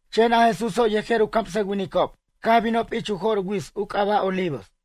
Chen a Jesúso' yejer u camsʌwinicob caj binob ich u jo'r wits u c'aba' Olivos.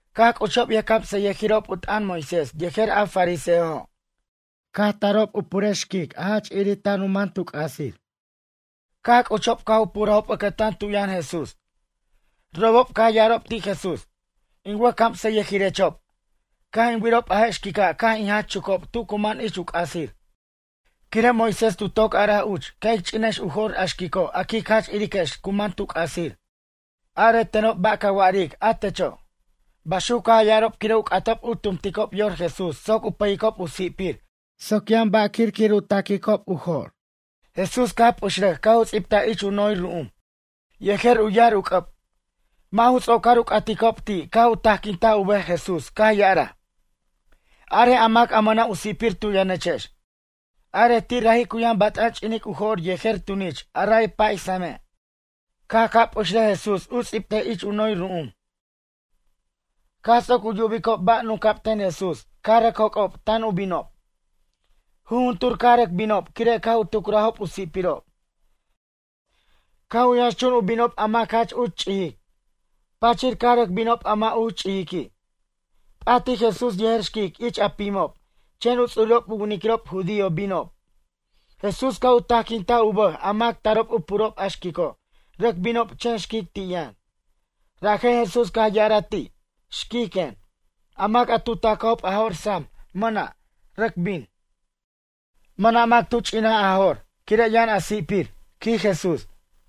Caj c'uchob yʌjcamsʌyʌjirob u t'ʌn Moisés yejer a fariseojo'. Caj tarob u purej xquic a jach irir tan u man tu c'asir. Caj c'uchob caj u purajob ʌcʌtan tu yʌn Jesús. Robob caj ya'arob ti' Jesús: ―In wʌjcamsʌyʌjirechob, caj in wirob a je' xquica' caj in jach chucob tu cu man ich u c'asir. Quire' Moisés tu toc araj uch ca' ic ch'inex u jo'r a xquico' a quic jach iriquex cu man tu c'asir. Are tenob ba' ca wa'aric a techo'? Baxuc caj ya'arob quire' u c'atob u tumticob yor Jesús soc u pʌyicob u si'pir soc yʌn ba'wir quir u taquicob u jo'r. Jesús caj p'uxrʌj caj u ts'ibtaj ich u noy ru'um yejer u yar u c'ʌb. Mʌ' ju ts'ocor u c'aticob ti' caj u tajquintaj u bʌj Jesús caj ya'araj: ―Arej a mac a mʌna' u si'pir tu yʌnechex, arej ti' raji' cu yʌn bat'an ch'inic u jo'r yejer tunich a ray pay same'. Caj ca' p'uxrʌj Jesús u ts'ibtej ich noy ru'um. Caj ts'oc u yubicob ba' nunca'b ten Jesús caj rʌc joc'ob tan u binob. Jujuntur caj rʌc binob quire' caj u tucurajob u si'pirob. Caj u yʌnxchun u binob a mac jach uch ch'ijic, pachir caj rʌc binob a mʌ' uch ch'ijiqui'. P'atij Jesús yejer xquic ich a pimob chen u ts'urirob u winiquirob judío binob. Jesús caj u tajquintaj u bʌj a mac tarob u purob a xquico' rʌc binob chen xquic ti' yʌn. Rajen Jesús caj ya'araj ti': ―Xquic ―quen―. A mac a tu ta'cajob a jo'r sam mʌna', rʌc bin. Mʌna' mac tu ch'inaj a jo'r quire' yʌn a si'pir ―quij Jesús.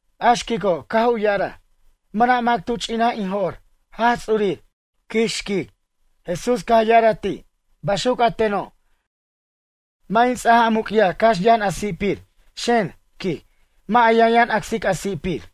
A xquico' caj u ya'araj: ―Mʌna' mac tu ch'inaj in jo'r, Jaj Ts'urir ―quij xquic. Jesús caj ya'araj ti': ―Baxuc a teno', mʌ' in ts'aj a muc'yaj cax yʌn a si'pir. Xen ―quij―, mʌ' a yʌnyʌn acsic a si'pir.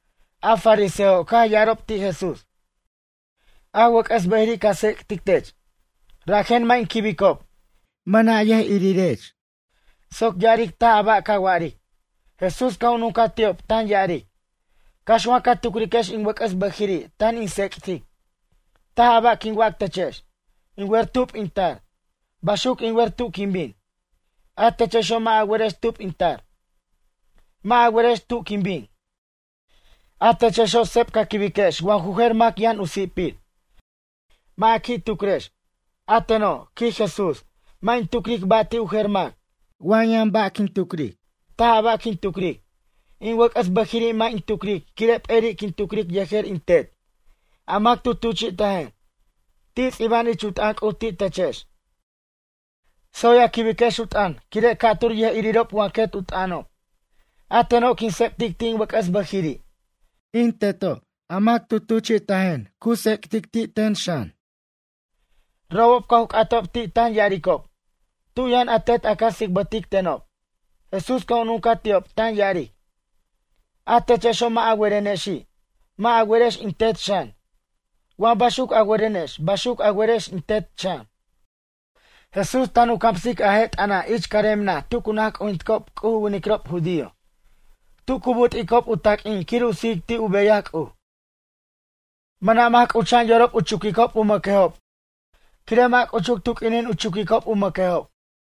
A fariseojo' caj ya'arob ti' Jesús: ―A wʌc'ʌs bʌjiri' ca tsec'tic tech, rajen mʌ' in quibicob. Mʌna' yʌj'irirech soc ya'aric taj a ba' ca wa'aric. Jesús caj u nuncaj ti'ob tan ya'aric: ―Cax wa ca tucriquex in wʌc'ʌs bʌjiri' tan in tsec'tic. Taj a ba' quin wac techex. In wer tub in tar, baxuc in wer tu' quin bin. A techexo' mʌ' a werex tub in tar, mʌ' a werex tu' quin bin. A techexo' seb ca quibiquex wa ju jer mac yʌn u si'pir. Mʌ' a qui' tucrex. A teno' ―quij Jesús―, mʌ' in tucric ba' ti' u jer mac. Wa yʌn ba' quin tucric, taj a ba' quin tucric. In wʌc'ʌs bʌjiri' mʌ' in tucric quire' p'eri' quin tucric yejer in Tet, a mac tu tuchi'tajen. Ti' ts'iba'an ich u t'ʌn C'uj ti' techex: “Tsoy a quibiquex u t'ʌn quire' ca'tur yʌj'irirob wa quet u t'ʌnob.” A teno' quin tsec'tic ti' in wʌc'ʌs bʌjiri'. In Teto' a mac tu tuchi'tajen, cu tsec'tic ti' ten xan. Robob caj u c'atob ti' tan ya'aricob: ―Tu' yʌn a Tet a ca tsicbʌtic tenob? Jesús caj u nuncaj ti'ob tan ya'aric: ―A techexo' mʌ' a werenexi'. Mʌ' a werex in Tet xan. Wa baxuc a werenex baxuc a werex in Tet xan. Jesús tan u camsic a je' t'ʌna' ich carem naj tu cu naj c'ujinticob C'uj u winiquirob judío tu cu but'icob u taq'uin quir u sijic ti' u beyaj C'uj. Mʌna' mac c'ucha'an yorob u chuquicob u mʌquejob quire' mʌ' c'uchuc tu q'uinin u chuquicob u mʌquejob.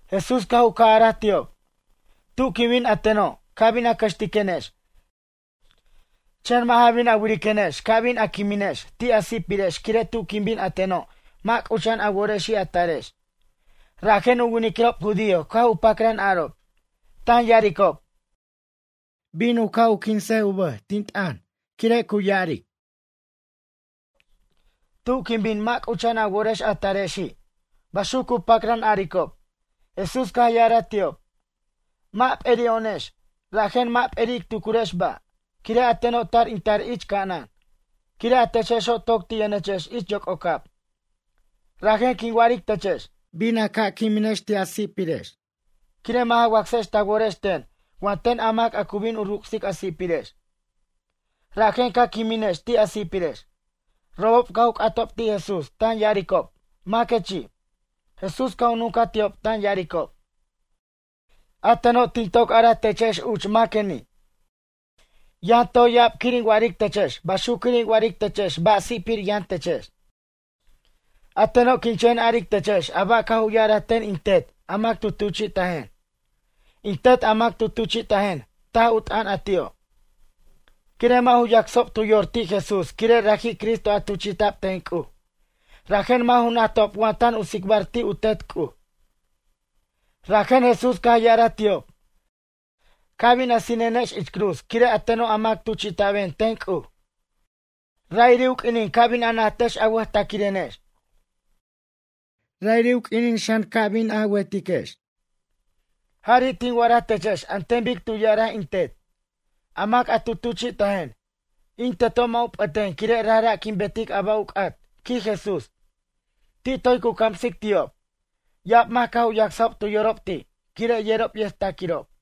Jesús caj u ca' araj ti'ob: ―Tu' quin bin a teno', ca bin a cʌxtiquenex, chen mʌ' ja bin a wiriquenex ca bin a quiminex ti' a si'pirex quire' tu' quin bin a teno' mʌ' c'ucha'an a worexi' a tarex. Rajen u winiquirob judío caj u pacran arob, tan ya'aricob: ―Bin u ca' quins u bʌj, tin t'ʌn quire' cu ya'aric: “Tu' quin bin mʌ' c'ucha'an a worex a tarexi'”, ―baxuc cu pacran aricob. Jesús caj ya'araj ti'ob: ―Mʌ' p'eri'o'onex, rajen mʌ' p'eri' ic tucriquex ba', quire' a teno' tar in tar ich ca'anan, quire' a techexo' toc ti' yʌnechex ich yoc'ocab. Rajen quin wa'aric techex: Bin a ca' quiminex ti' a si'pirex, quire' mʌ' ja wacsex ta worex ten wa ten a mac cu bin u rucsic a si'pirex. Rajen ca quiminex ti' a si'pirex. Robob caj u c'atob ti' Jesús tan ya'aricob: ―Maquechi'? Jesús caj u nuncaj ti'ob tan ya'aricob: ―A teno' tin toc araj techex uch maqueni'. Yʌn toy ya'ab quir in wa'aric techex baxuc quir in wa'aric techex ba' si'pir yʌn techex. A teno' quin chen aric techex a ba' caj u ya'araj ten in Tet a mac tu tuchi'tajen. In Tet a mac tu tuchi'tajen, taj u t'ʌn a ti'o'. Quire' mʌ' ju yacsob tu yor ti' Jesús quire' raji' Cristo a tuchi'ta'b ten C'uj, rajen mʌ' ju najtob wa tan u tsicbar ti' u Tet C'uj. Rajen Jesús caj ya'araj ti'ob: ―Ca' bin a sinenex ich cruz quire' a teno' a mac tuchi'ta'ben ten C'uj, ra'iri' u q'uinin ca' bin a najtex a wʌjtaquirenex. Ra'iri' u q'uinin xan ca' bin a wetiquex, jari' tin wa'araj techex an ten bic tu ya'araj in Tet, a mac a tu tuchi'tajen. In Teto' mʌ' u p'ʌten quire' rajra' quin betic a ba' u c'at ―quij Jesús. Ti' toy cu camsic ti'ob, ya'ab mac caj u yacsajob tu yorob ti', quire' yerob yʌjtaquirob.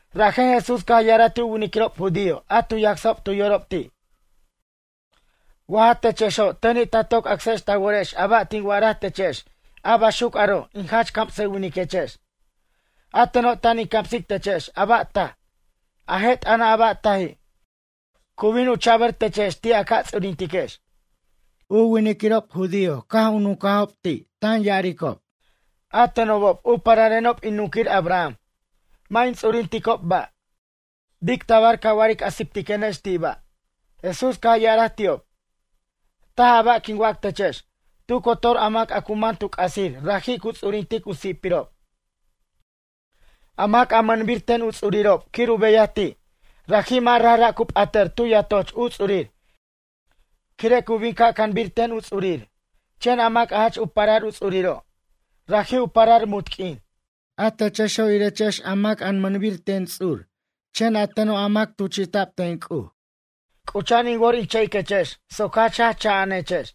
Rajen Jesús caj ya'araj ti' u winiquirob judío a tu yacsajob tu yorob ti': ―Wa ja techexo' teni' ta toc acsex ta worex a ba' tin wa'araj techex a baxuc aro' in jach camsʌwiniquechex. A teno' tan in camsic techex a ba' taj, a je' t'ʌna' a ba' taji' cu bin u cha'bʌr techex ti' a ca ts'urintiquex. U winiquirob judío caj u nuncajob ti' tan ya'aricob: ―A tenobob u pararenob in nunquir Abraham, mʌ' in ts'urinticob ba'. Bic tabar ca wa'aric a siptiquenex ti' ba'. Jesús caj ya'araj ti'ob: ―Taj a ba' quin wac techex. Tu cotor a mac a cu man tu c'asir raji' cu ts'urintic u si'pirob. A mac a mʌnbir ten u ts'uriro' quir u beyaj ti', raji' mʌ' rajra' cu p'atʌr tu yatoch u ts'urir quire' cu bin ca' canbir ten u ts'urir. Chen a mac a jach u parar u ts'uriro', raji' u parar munt q'uin. A techexo' irechex a mac a mʌnbir ten ts'ur chen a teno' a mac tuchi'ta'b ten C'uj c'ucha'an in wor in cha'iquechex soc jach jaj cha'anechex.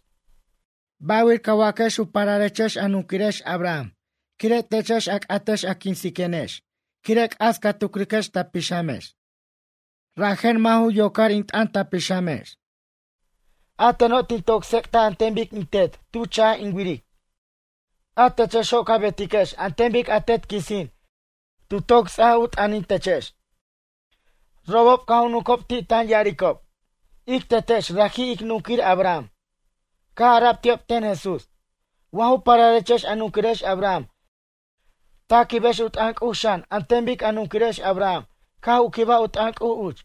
Bʌ'wir ca waquex u pararechex a nunquirex Abraham quire' techex a c'atex a quinsiquenex quire' c'as ca tucriquex ta pixamex. Rajen mʌ' ju yocar in t'ʌn ta pixamex. A teno' tin tsec'taj an ten bic in Tet tu cha'j in wiric. A techexo' ca betiquex an ten bic a tet quisin tu toc ts'aj u t'ʌnintechex. Robob caj u nuncob ti' tan ya'aricob: ―Ic tetex raji' ic nunquir Abraham. Caj ara'b ti'ob ten Jesús: ―Wa ju pararechex a nunquirex Abraham ta quibex u t'ʌn C'uj xan an ten bic a nunquirex Abraham caj u quibaj u t'ʌn C'uj uch.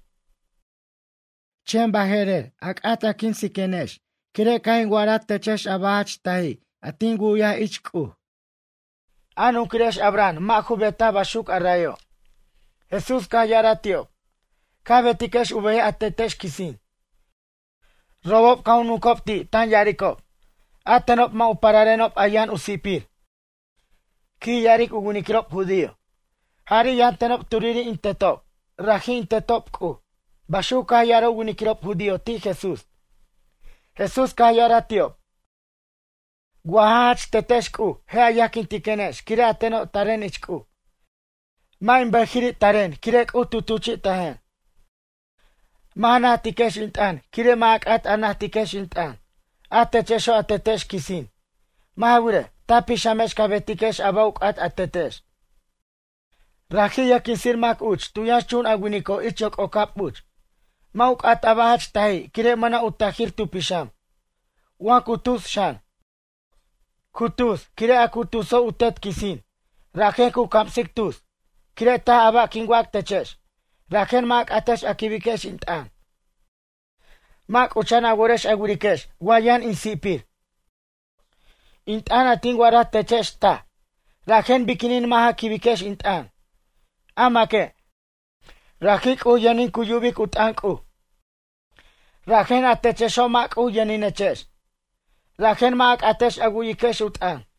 Chen baje'rer a c'at a quinsiquenex quire' caj in wa'araj techex a ba' jach taji' a tin wu'yaj ich C'uj. A nunquirex Abraham mʌ' ju betaj baxuc a'rayo'. Jesús caj ya'araj ti'ob: ―Ca betiquex u beyaj a tetex quisin. Robob caj u nuncob ti' tan ya'aricob: ―A tenob mʌ' u pararenob a yʌn u si'pir ―quij ya'aric u winiquirob judío―. Jari' yʌn tenob turiri' in tetob. Raji' in Tetob C'uj ―baxuc caj ya'araj u winiquirob judío ti' Jesús. Jesús caj ya'araj ti'ob: ―Wa ja jach tetex C'uj je' a yajquintiquenex quire' a teno' taren ich C'uj. Mʌ' in bʌjiri' taquen quire' C'uj tu tuchi'tajen. Mʌ' ja najtiquex in t'ʌn quire' mʌ' a c'at a najtiquex in t'ʌn. A techexo' a tetex quisin. Mʌ' ja wirej, ta pixamex ca betiquex a ba' u c'at a tetex. Raji' yʌjquinsir mac uch tu yʌnxchun a winico' ich yoc'ocab uch. Mʌ' u c'at a ba' jach taji' quire' mʌna' u tajir tu pixam. Wa cu tus xan, cu tus quire' a cu tuso' u tet quisin, rajen cu camsic tus. Quire' taj a ba' quin wac techex, rajen mʌ' a c'atex a quibiquex in t'ʌn. Mʌ' c'ucha'an a worex a wiriquex wa yʌn in si'pir. In t'ʌn a tin wa'araj techex taj, rajen biquinin mʌ' ja quibiquex in t'ʌn? A maque', raji' C'uj yʌnin cu yubic u t'ʌn C'uj. Rajen a techexo' mʌ' C'uj yʌninechex. Rajen mʌ' a c'atex a wu'yiquex u t'ʌn.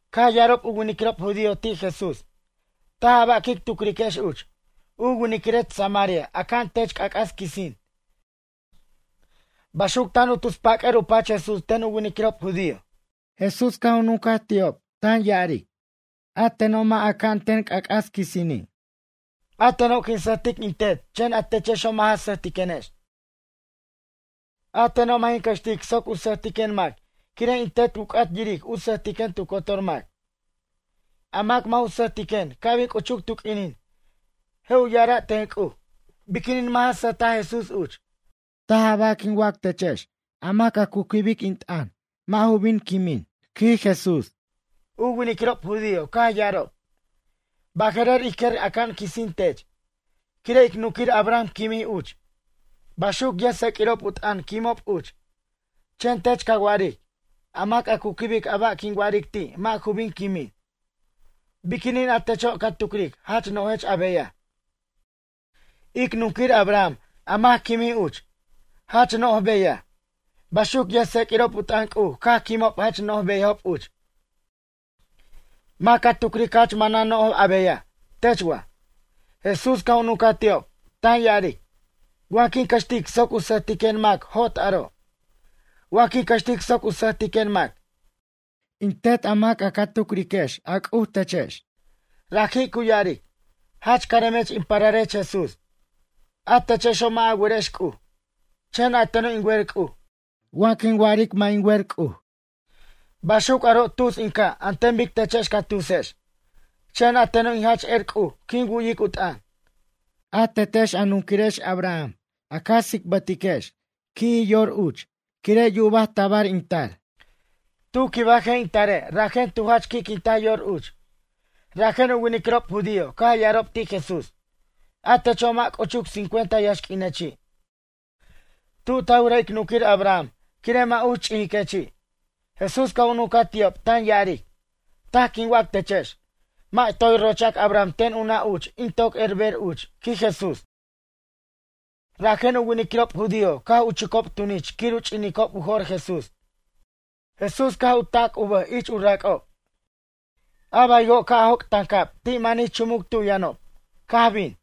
Caj ya'arob u winiquirob judío ti' Jesús. ―Taj a ba' quic tucriquex uch. U winiquirech samaria aca'an tech c'ac'as quisin ―baxuc tan u tus pac'ʌr u pach Jesús ten u winiquirob judío. Jesús caj u nuncaj ti'ob, tan ya'aric; ―A teno' mʌ' aca'an ten c'ac'as quisini'. A teno' quin sʌjtic in Tet chen a techexo' mʌ' ja sʌjtiquenex. A teno' mʌ' jin cʌxtic soc u sʌjtiquen mac quire' in Tet u c'at yiric u sʌjtiquen tu cotor mac. A mac mʌ' u sʌjtiquen ca' bin c'uchuc tu q'uinin. Je' u ya'ara' ten C'uj: Biquinin mʌ' ja sʌjtaj Jesús uch? Taj a ba' quin wac techex a mac a cu quibic in t'ʌn mʌ' ju bin quimin ―quij Jesús. U winiquirob judío caj ya'arob: ―Baje'rer ij quer aca'an quisin tech. Quire' ic nunquir Abraham quimij uch. Baxuc yʌjtseq'uirob u t'ʌn quimob uch. Chen tech ca wa'aric: “A mac a cu quibic a ba' quin wa'aric ti' mʌ' ju bin quimin.” Biquinin a techo' ca tucric jach no'jech a beyaj? Ic nunquir Abraham a mac quimij uch, jach no'j beyaj. Baxuc yʌjtseq'uirob u t'ʌn C'uj caj quimob jach no'j beyajob uch. Mac ca tucric jach manan no'j a beyaj, tech wa? Jesús caj u nuncaj ti'ob, tan ya'aric: ―Wa quin cʌxtic soc u sʌjtiquen mac jot aro'. Wa quin cʌxtic soc u sʌjtiquen mac, in Tet a mac ca tucriquex a C'uj techex, raji' cu ya'aric: “Jach caremech in pararech Jesús.” A techexo' mʌ' a werex C'uj. Chen a teno' in wer C'uj. Wa quin wa'aric mʌ' in wer C'uj, baxuc aro' tus in ca' an ten bic techex ca tusex. Chen a teno' in jach er C'uj quin wu'yic u t'ʌn. A tetex a nunquirex Abraham a ca tsicbʌtiquex qui'ji yor uch quire' yuba tabar in tar. Tu quibaj je' in tare' rajen tu jach qui'quintaj yor uch. Rajen u winiquirob judío caj ya'arob ti' Jesús: ―A techo' mʌ' c'uchuc cincuenta yaxq'uinechi'. Tu' ta wiraj ic nunquir Abraham quire' mʌ' uch ch'ijiquechi'? Jesús caj u nuncaj ti'ob tan ya'aric: ―Taj quin wac techex. Mʌ' toy rochac Abraham ten u nʌ' uch in toc berer uch ―quij Jesús. Rajen u winiquirob judío caj u chucob tunich quir u ch'inicob u jo'r Jesús. Jesús caj u ta'c u bʌj ich u rac'ob. A baywo' ca' joc' tancab ti' manij chumuc tu' yʌnob, caj bin.